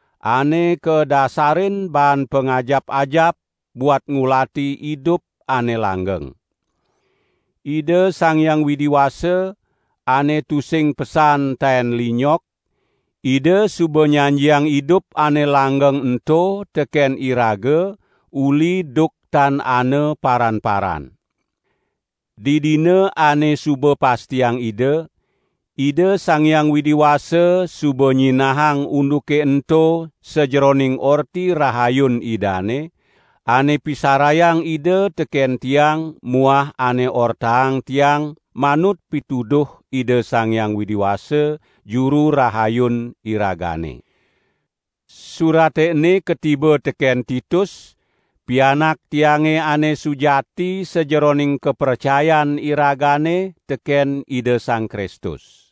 ane kadasarin baan pangajap-ajap buat ngulati idup ane langgeng. Ida Sang Hyang Widi Wasa, ane tusing pesan taen linyok, Ida suba nyanjiang idup ane langgeng ento teken iraga uli duk tan ana paran-paran. Didina ane suba pastiang Ida, Ida Sang Hyang Widi Wasa suba nyinahang unduke ento sajeroning Orti Rahayun Idane, ane pisarayang Ida teken tiang muah ane ortaang tiang manut pituduh Ida Sang Hyang Widi Wasa, Juru Rahayun iragane. Surate ene katiba teken Titus, pianak tiange ane sujati sajeroning kapracayan iragane teken Ida Sang Kristus.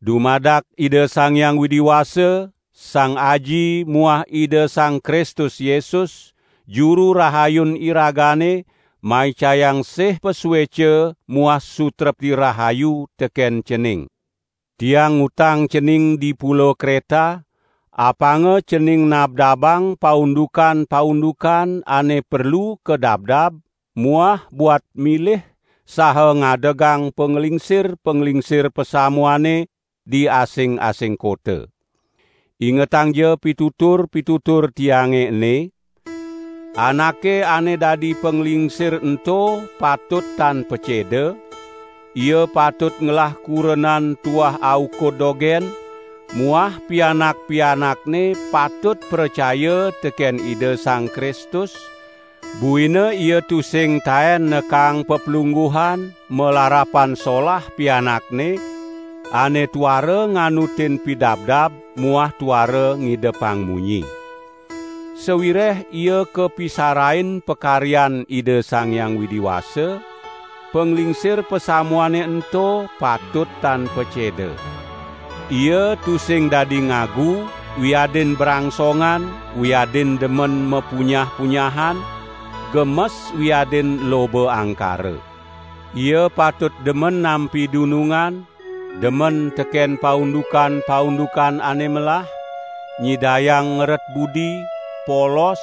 Dumadak Ida Sang Hyang Widi Wasa, Sang Aji muah Ida Sang Kristus Yesus, Juru Rahayun iragane maicayang sih pasueca muah sutrepti rahayu teken cening. Tiang ngutang cening di Pulo Kreta, apanga cening nabdabang paundukan-paundukan ane perlu kadabdab muah buat milih saha ngadegang panglingsir-panglingsir pasamuane di asing-asing kota. Ingetangja pitutur-pitutur tiange ene; anake ane dadi panglingsir ento patut tan paceda; ia patut ngelah kurenan tuah aukud dogen muah pianak-pianakne patut pracaya teken Ida Sang Kristus, buina ia tusing taen nekaang paplungguhan malarapan solah pianakne ane tuara nganutin pidabdab muah tuara ngidepang munyi. Sawireh ia kapisarain pakaryan Ida Sang Hyang Widi Wasa, panglingsir pasamuane ento patut tan paceda. Ia tusing dadi ngagu wiadin brangsongan wiadin demen mapunyah-punyahan, gemes wiadin loba angkara. Ia patut demen nampi dunungan, demen teken paundukan-paundukan ane melah, nyidayang ngeret budi, polos,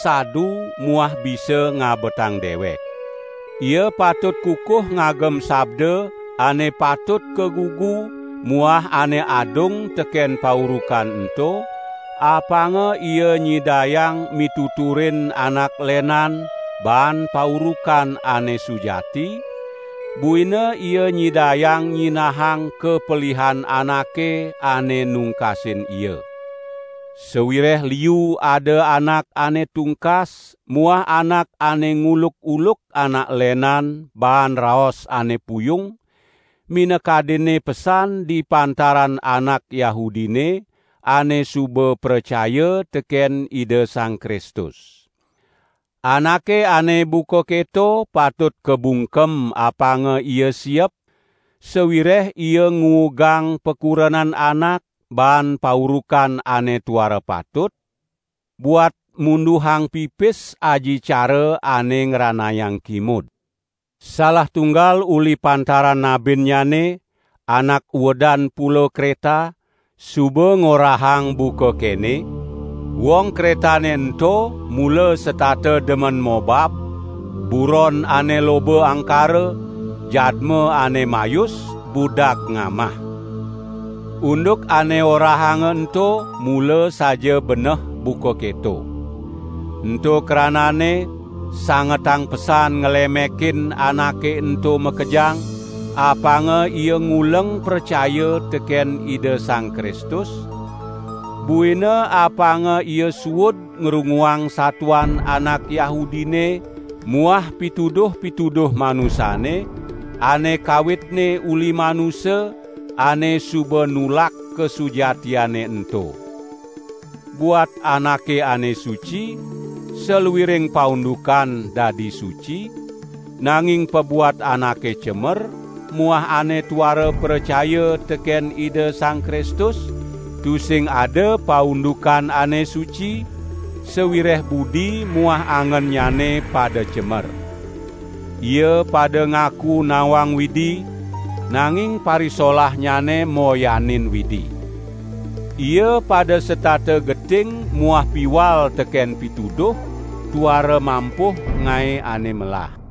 sadu muah bisa ngabetang dewek. Ia patut kukuh ngagem sabda ane patut kagugu muah ane adung teken paurukan ento, apanga ia nyidayang mituturin anak lenan baan paurukan ane sujati, buina ia nyidayang nyinahang kapelihan anake ane nungkasin ia. Sawireh liu ada anak ane tungkas muah anak ane nguluk-uluk anak lenan baan raos ane puyung, minakadinne pesan di pantaran anak Yahudine ane suba pracaya teken Ida Sang Kristus. Anake ane buka keto patut kabungkem apanga ia siep, sawireh ia nguugang pakurenan anak baan paurukan ane tuara patut, buat munduhang pipis aji cara ane ngranayang kimud. Salah tunggal uli pantaran nabinnyane, anak uedan pulo Kreta, suba ngorahang buka kene: "Wong Kretane ento mula setata demen mobab, buron ane loba angkara, jadma ane mayus, budag ngamah." Unduk ane orahanga ento mula saja beneh buka keto. Ento krananne, sangetang pesan nglemekin anake ento makejang, apanga ia nguleng pracaya teken Ida Sang Kristus, buina apanga ia suud ngrunguang satuan anak Yahudine muah pituduh-pituduh manusane, ane kawitne uli manusa, ane suba nulak kasujatiane ento. Buat anake ane suci, saluiring paundukan dadi suci, nanging pabuat anake cemer muah ane tuara pracaya teken Ida Sang Kristus, tusing ada paundukan ane suci, sawireh budi muah angennyane pada cemer. Ia pada ngaku nawang Widi, nanging parisolahnyane moyanin Widi. Ia pada setata geting muah piwal teken pituduh, tuara mampuh ngae ane melah.